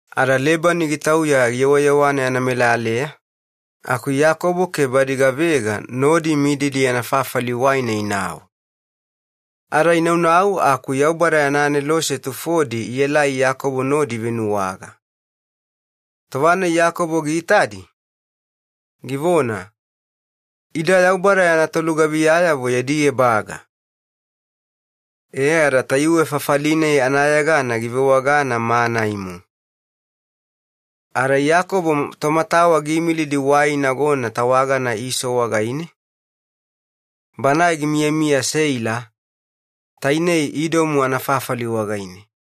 Ada Lebani gitauya giyewayewana yana melaleya, aku Iyakobo ke badi gavega nodi imididi yana fafali waina inau. Ada inaunau aku Yaubada yana aneloseyavo ielai Iyakobo nodi ivenuwaga. Tova-nai Iyakobo giitadi, givona, “Ida Yaubada yana tolugaviyamomo yadi ebaga.” E ada tayuwe fafali-nai anayegana givewagana Maanaimu. Ada Iyakobo tomatawa giimilidi wai inagona tawagana Iso wagaine gimiyamiya Seila, Idomu anafafali wagaine.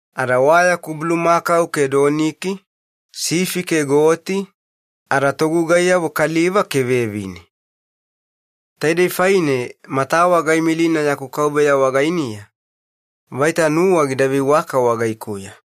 Ada wayaku bulumakau ke doniki, sifi ada goti ada togugaiyavo kaliva ke vevine. Taidei faine matawa gaimilina yaku kauveya wagainiya, vaita nuwa gida veiwaka wagaikuya.'”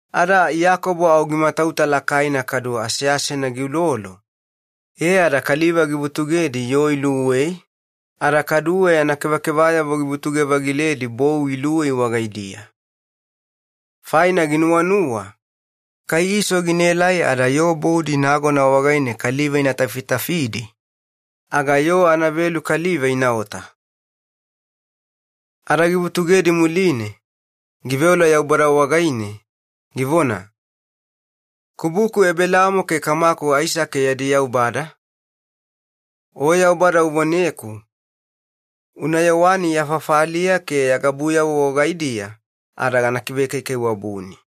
Ada Iyakobo au gimatauta lakaina kaduwe aseasena giulolo, e ada kaliva givutugedi yoo luwei ada kaduwe yana kevakevayavo givutuge-vagiledi bou luwei wagaidiya. Faina ginuwanuwa, “Kai Iso gina elaelai ada yoo boudi nagona wagaine kaliva ina tafitafidi aga yoo anavelu kaliva inaota.” Ada givutugedi muline giveola Yaubada wagaine, givona, “Kubuku Ebelaamo ke kamaku Aisake yadi Yaubada, O Yaubada uvoneku, ‘Unayewani ya fafaliya ke ya gabuyavo wagaidiya ada gana kivekaikaiwabuni.’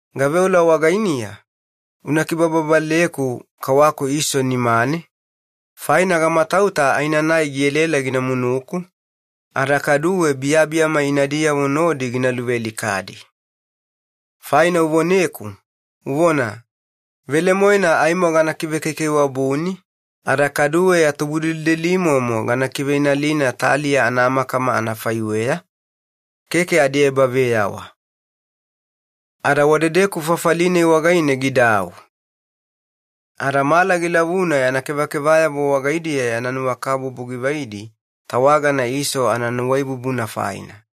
Gaveola wagainiya, una kibababaleku kawaku Iso nimane, faina gamatauta aenanai gielaela gina munuku ada kaduwe biyabiyama inadiyavo nodi gina luvealikadi. Faina uvoneku, uvona, ‘Velemoena aimo gana kivekaikaiwabuni, ada kaduwe ya tubudelidelimomo gana kiveinalina taliya anamakama anafaiweya, keke adiebaveyawa.’” Ada wadedeku fafali-nai wagaine gidau. Ada mala gilavuna yana kevakevayavo wagaidiya yana nuwakabubu givaidi tawagana Iso ananuwaibubuna faina.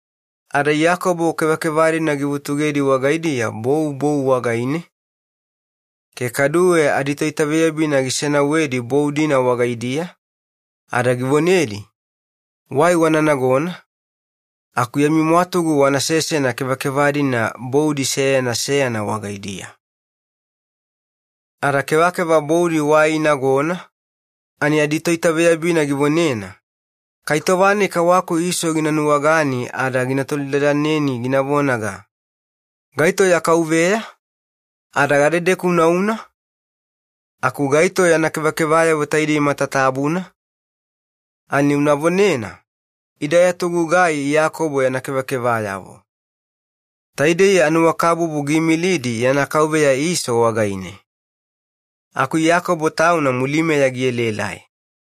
Ada Iyakobo kevakeva-dina givutugedi makakaudiga bou bou wagaidiya, ke kaduwe aditoitaveyabina gisenauwedi bou-dina wagaidiya ada givonedi, “Wai wana nagona, aku yami mwatugu wana sesena kevakeva-dina boudi seyana seyana wagaidiya.” Ada kevakeva boudi wai inagona ani aditoitaveyabina givonena, “Kai tova-nai kawaku Iso gina nuwagani gina tolidadaneni gina vonaga, ‘Gaito ya kauveya? Ada gadedeku unauna? Aku gaito yana kevakevayavo taidei matatabuna?’ Ani una vonena, ‘Ida ya togugai Iyakobo yana kevakevayavo, taidei anuwakabubu giimilidi yana kauveya Iso wagaine. Aku Iyakobo tauna mulimeya gielaelai.’”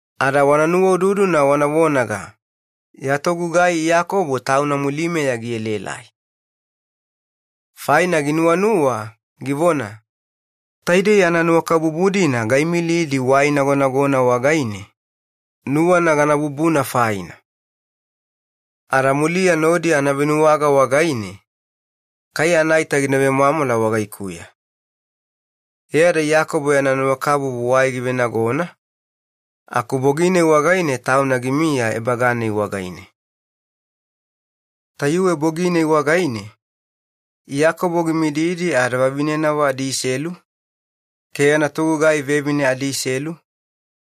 Wana nuwaududuna wana vonaga, ‘Ya togugai Iyakobo tauna mulimeya gielaelai.’” Faina ginuwanuwa, givona, “Taidei ananuwakabubu-dina gaimilidi wai inagonagona wagaine nuwana gana bubuna faina, aku muliya kai anavenuwaga aga kai anaita gina vemwamwala wagaikuya.” E ada Iyakobo yana nuwakabubu wai givenagona, aku tauna gidau ebaga-nai wagaine. Tayuwe bogi-nai wagaine Iyakobo gimididi ada vavinenavo adiselu ke yana togugai vevine adiselu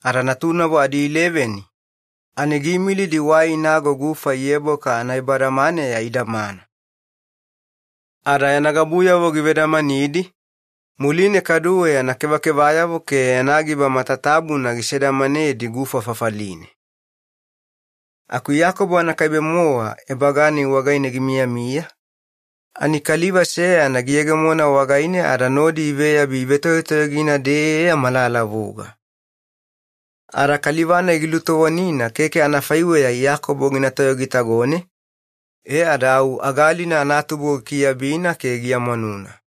ada natunavo adiileveni giimilidi wai inago gufa Yeboka anaebadamaneya idamana. Ada yana gabuyavo givedamanidi, muline kaduwe yana giba matatabuna gisedamanedi gufa fafaline. Aku Iyakobo anakaibe-mowa isegena, ada gimiyamiya ani Kaliva seyana giyegemona wagaine ada nodi iveyabi ivetoyotoyogina-deya malalavuga. Ada Kaliva-nai gilutovonina keke anafaiweya Iyakobo gina toyogitagone e ada au agalina anatubo gilumwanuna.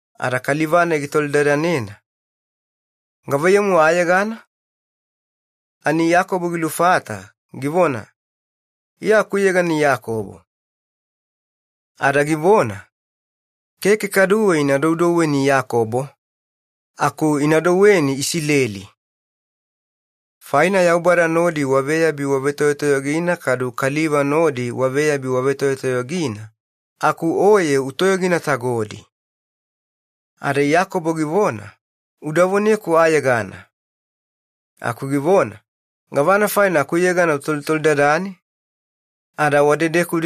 Ada Kaliva-nai gitolidadanena, “Gavaiyamu ayegana?” Ani Iyakobo gilufata, givona, “Iya akuyegana Iyakobo.” Ada givona, “Keke kaduwe ina doudouweni ‘Iyakobo’, aku ina douweni ‘Isileli’, faina Yaubada nodi waveyabi wavetoyotoyogina ada kaliva nodi waveyabi wavetoyotoyogina, aku oye utoyoginatagodi.” Ada Iyakobo givona, “Udavoneku ayegana.” Aku givona, “Gavana faina akuyegana utotolidadane?” Ada wadedeku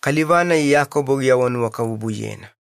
Kaliva-nai Iyakobo giawanuwakabubuyena.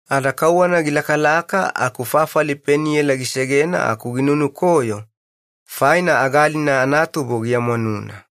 Ada kauwana gilaka ani bana Peniela gisegena, aku ginunukoyo faina agalina anatubo giamwanuna.